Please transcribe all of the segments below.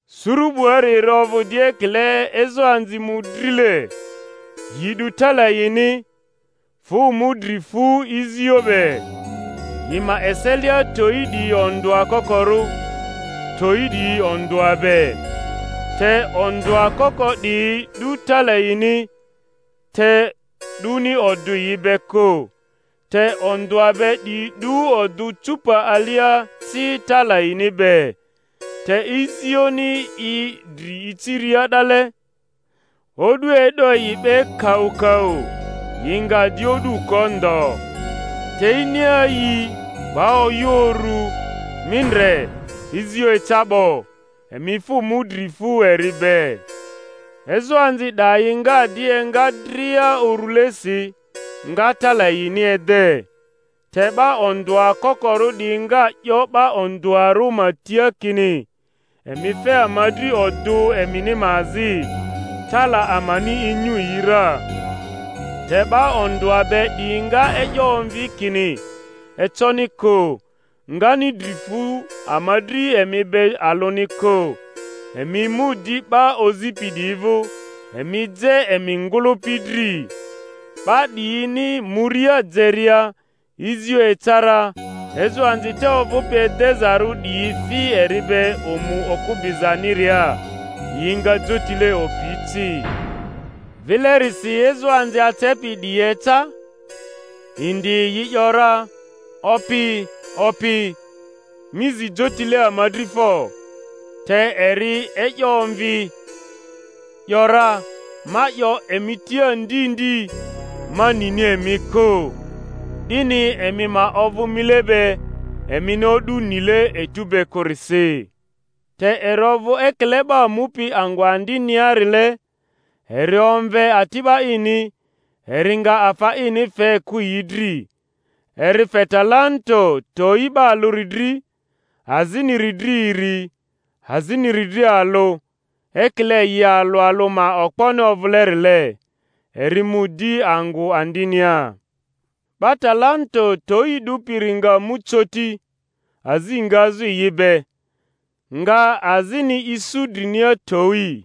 Suru 'buari eri ovᴜ di ekile ezoanzi mᴜdrile, yi 'du tala yini, fᴜ mu dri fu izio be. Yi ma eselia, towi 'diyi ondᴜa kokorᴜ, towi 'diyi ondᴜa be. Te ondᴜa koko 'diyi 'du tala yini, te 'duni odᴜ yi be kᴜ; te ondᴜa be 'diyi 'du odᴜ cupa alia ci tala yini be. Te izioni i dri iciria 'dale, o'du e'do yi 'be kaukau, yi nga di o'du ko ndo. Te iniayii, 'ba oyᴜ urᴜ, Mi ndre, izio eca 'bo! Emi fᴜ mu dri fu eri be. Ezoanzi 'dayi nga di enga dria urulesi, nga tala yini ede. Te 'ba ondᴜa kokorᴜ 'diyi nga 'yo 'ba ondᴜarᴜ ma tia kini, Emi fe ama dri odᴜ emini ma azi; tala amani inyu yi ra. Te 'ba ondᴜa be 'diyi nga e'yo omvi kini, Econi kᴜ, ngani dri fu ama dri emi be alᴜni kᴜ; emi mu di 'ba ozipi 'diyi vᴜ, emi je emi ngᴜlᴜpi dri. 'Ba 'diyini muria jeria, izio eca ra, ezoanzi te ovᴜpi edezarᴜ 'diyi fi eri be omu okᴜ bizaniria; yi nga jotile opi ci. Vilerisi ezoanzi acepi 'diyi eca. indi, yi ‘yora, Opi, opi, mi zi jotile ama dri fo! Te eri e'yo omvi, ‘yora, Ma 'yo emi tia ndi ndi, ma nini emi kᴜ. 'Dini emi ma ovᴜ mile be, emini o'du nile etu be kᴜrisi. Te eri ovᴜ ekile 'ba mupi angᴜ andiniarile, eri omve ati'ba ini, eri nga afa ini fe kᴜ yi dri; eri fe talanto towi 'ba alᴜri dri, aziniri dri iri, aziniri dri alᴜ; ekile yi alᴜ alᴜ ma okponi ovᴜlerile. Eri mu di angᴜ andinia. 'Ba talanto towi 'dupiri nga mu coti, azi ngazᴜ yi be, nga azini isu drinia towi.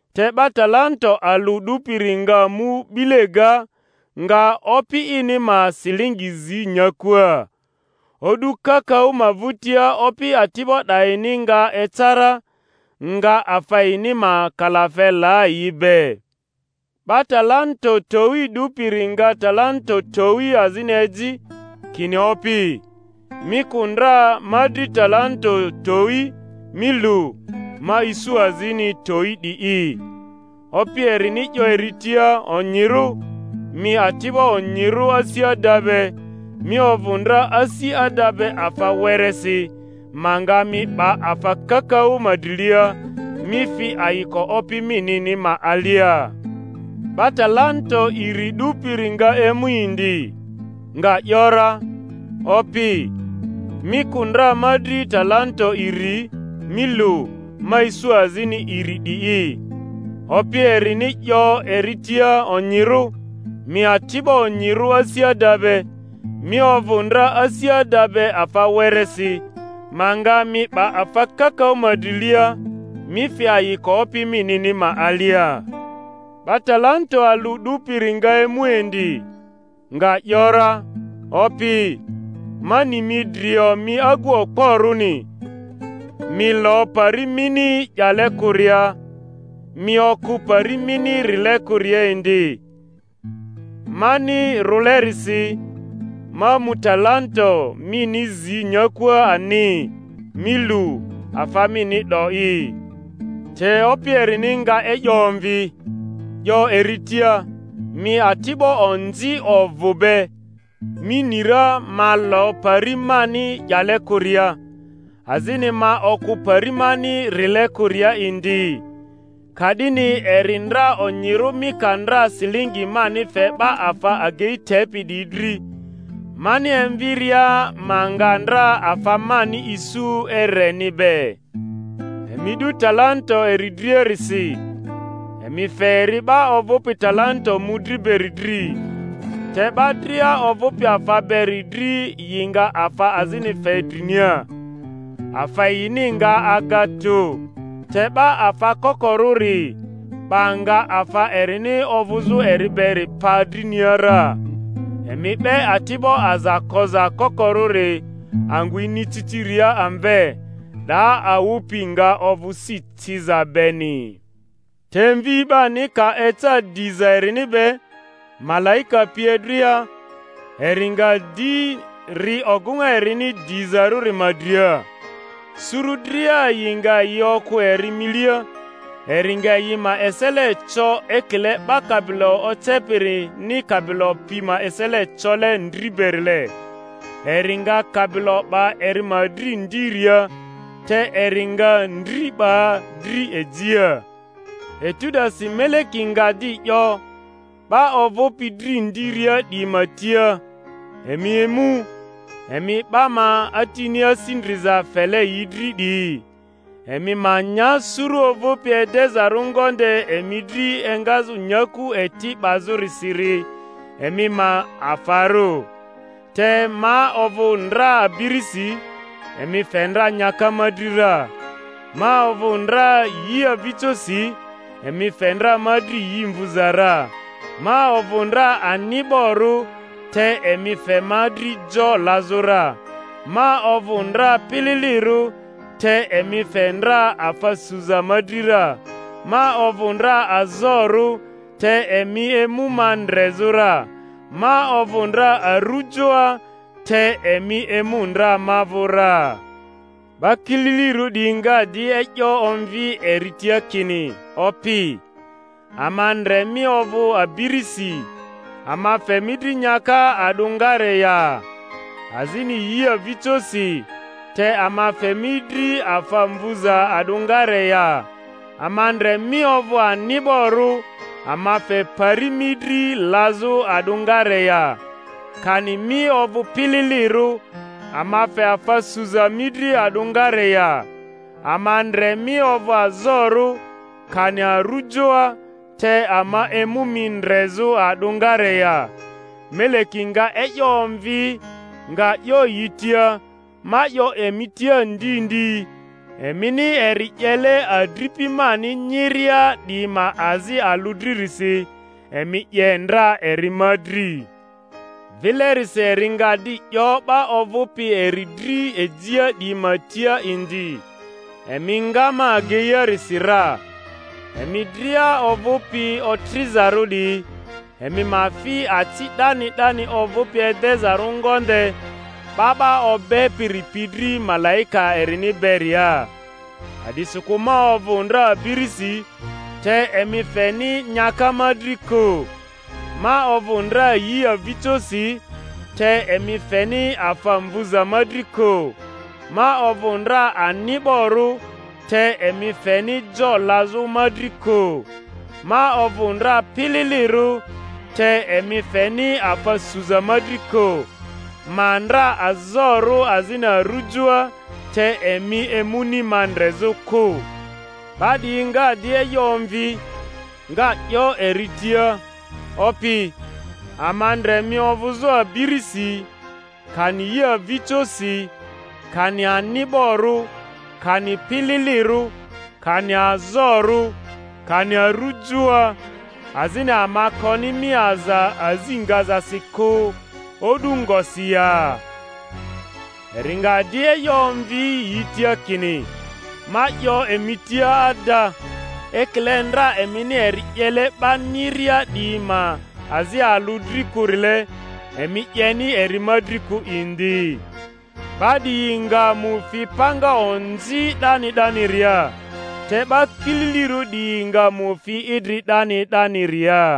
Te 'ba talanto alᴜ 'dupiri nga mu 'bile ga, nga opi ini ma silingi zi nyakua. O'du kakaᴜ ma vᴜtia opi ati'ba 'dayini nga eca ra, nga afa yini ma kalafe la yi be. 'Ba talanto towi 'dupiri nga talanto towi azini eji, kini, Opi, mi kᴜ ndra ma dri talanto towi; mi lu, ma isu azini towi 'di'i. Opi erini 'yo eri tia, Onyirᴜ, mi ati'bo onyirᴜ asi ada be; mi ovᴜ ndra asi ada be afa weresi, ma nga mi 'ba afa kakaᴜ ma drilia; mi fi ayiko opi minini ma alia. 'Ba talanto iri 'dupiri nga emu indi, nga ‘yora, Opi, mi kᴜ ndra ma dri talanto iri; mi lu, ma isu azini iri 'di'i. Opi erini 'yo eri tia, Onyirᴜ, mi ati'bo onyirᴜ asi ada be; mi ovᴜ ndra asi ada be afa weresi, ma nga mi 'ba afa kakaᴜ ma drilia; mi fi ayiko opi minini ma alia. 'Ba talanto alᴜ 'dupiri nga emu indi, nga ‘yora, Opi, ma ni mi drio mi agu okporᴜni, mi lo pari mini 'yale kᴜria, mi okᴜ pari mini rile kᴜria indi; mani rᴜlerisi, ma mu talanto mini zi nyakua ani. Mi lu, afa mini 'do'i. Te opi erini nga e'yo omvi, 'yo eri tia, Mi ati'bo onzi ovᴜ be! Mi ni ra ma lo pari mani 'yale kᴜria, azini ma okᴜ pari mani rile kᴜria indi? Ka'dini eri ndra onyirᴜ mi ka ndra silingi mani fe 'ba afa agei tepi 'diyi dri, mani emviria ma nga ndra afa mani isu ereni be. Emi 'du talanto eri driarisi, emi fe eri 'ba ovᴜpi talanto mᴜdri beri dri. Te 'ba dria ovᴜpi afa beri dri yi nga afa azini fe drinia, afa yini nga aga tᴜ; te 'ba afa kokorᴜri, 'ba nga afa erini ovᴜzᴜ eri beri pa drinia ra. Emi 'be ati'bo aza koza kokorᴜri angᴜ iniciciria amve; 'daa awᴜ pi nga ovᴜ si ciza beni. Te Mvi 'bani ka eca diza erini be, malaika pie dria, eri nga di ri ogᴜŋa erini dizarᴜri ma dria. Suru dria yi nga yi okᴜ eri milia, eri nga yi ma esele co ekile 'ba kabilo ocepirini kabilo pi ma esele cole ndri berile; eri nga kabilo 'ba eri ma dri ndiria, te eri nga ndri 'ba dri ejia. Etu 'dasi Meleki nga di 'yo 'ba ovᴜpi dri ndiria 'diyi ma tia, Emi emu, emi 'ba ma Atini asi ndriza fele yi dri 'diyi, emi ma nya suru ovᴜpi edezarᴜ ngonde emi dri engazᴜ nyaku eti 'bazᴜrisiri emi ma afarᴜ; te ma ovᴜ ndra abirisi, emi fe ndra nyaka ma dri ra; ma ovᴜ ndra yi avijosi, emi fe ndra ma dri yi mvu ra; ma ovᴜ ndra ani'borᴜ, te emi fe ma dri jo lazᴜ ra; ma ovᴜ ndra pililirᴜ, te emi fe ndra afa suza ma dri ra; ma ovᴜ ndra azorᴜ, te emi emu ma ndrezᴜ ra; ma ovᴜ ndra arujoa, te emi emu ndra ma vᴜ ra. 'Ba kililirᴜ 'diyi nga di e'yo omvi eri tia kini, Opi, ama ndre mi ovᴜ abirisi, ama fe mi dri nyaka a'dᴜngare ya? azini yi avijosi, te ama fe mi dri afa mvuza a'dᴜngare ya? Ama ndre mi ovᴜ ani'borᴜ, ama fe pari mi dri lazᴜ a'dᴜngare ya? kani mi ovᴜ pililirᴜ, ama fe afa suza mi dri a'dᴜngare ya? Ama ndre mi ovᴜ azorᴜ, kani arujoa, te ama emu mi ndrezᴜ a'dᴜngare ya? Meleki nga e'yo omvi, nga 'yo yi tia, Ma 'yo emi tia ndi ndi, emini eri 'yele adripi mani nyiria 'diyi ma azi alᴜ dririsi, emi 'ye ndra eri ma dri. Vilerisi eri nga di 'yo 'ba ovᴜpi eri dri ejia 'diyi ma tia indi, Emi nga ma ageiarisi ra, emi dria ovᴜpi otrizarᴜ 'diyi, emi ma fi aci 'dani 'dani ovᴜpi edezarᴜ ngonde 'ba 'ba obepiri pi dri malaika erini beria. A'disikᴜ ma ovᴜ ndra abirisi, te emi feni nyaka ma dri kᴜ; ma ovᴜ ndra yi avijosi, te emi feni afa mvuza ma dri kᴜ; ma ovᴜ ndra ani'borᴜ, te emi feni jo lazᴜ ma dri kᴜ; ma ovᴜ ndra pililirᴜ, te emi feni afa suza ma dri kᴜ; ma ndra azorᴜ azini arᴜjoa, te emi emuni ma ndrezᴜ kᴜ. 'Ba 'diyi nga di e'yo omvi, nga 'yo eri tia, Opi, ama ndre mi ovᴜzᴜ abirisi, kani yi avijosi, kani ani'borᴜ, kani pililirᴜ, kani azorᴜ, kani arujoa, azini ama koni mi aza azi ngazasi kᴜ o'du ngosi ya? Eri nga di e'yo omvi yi tia kini, Ma 'yo emi tia ada, ekile ndra emini eri 'yele 'ba nyiria 'diyi ma azi alᴜ dri kᴜrile, emi 'yeni eri ma dri kᴜ indi. 'Ba 'diyi nga mu fi panga onzi 'dani 'daniria, te 'ba kililirᴜ 'diyi nga mu fi idri 'dani 'daniria.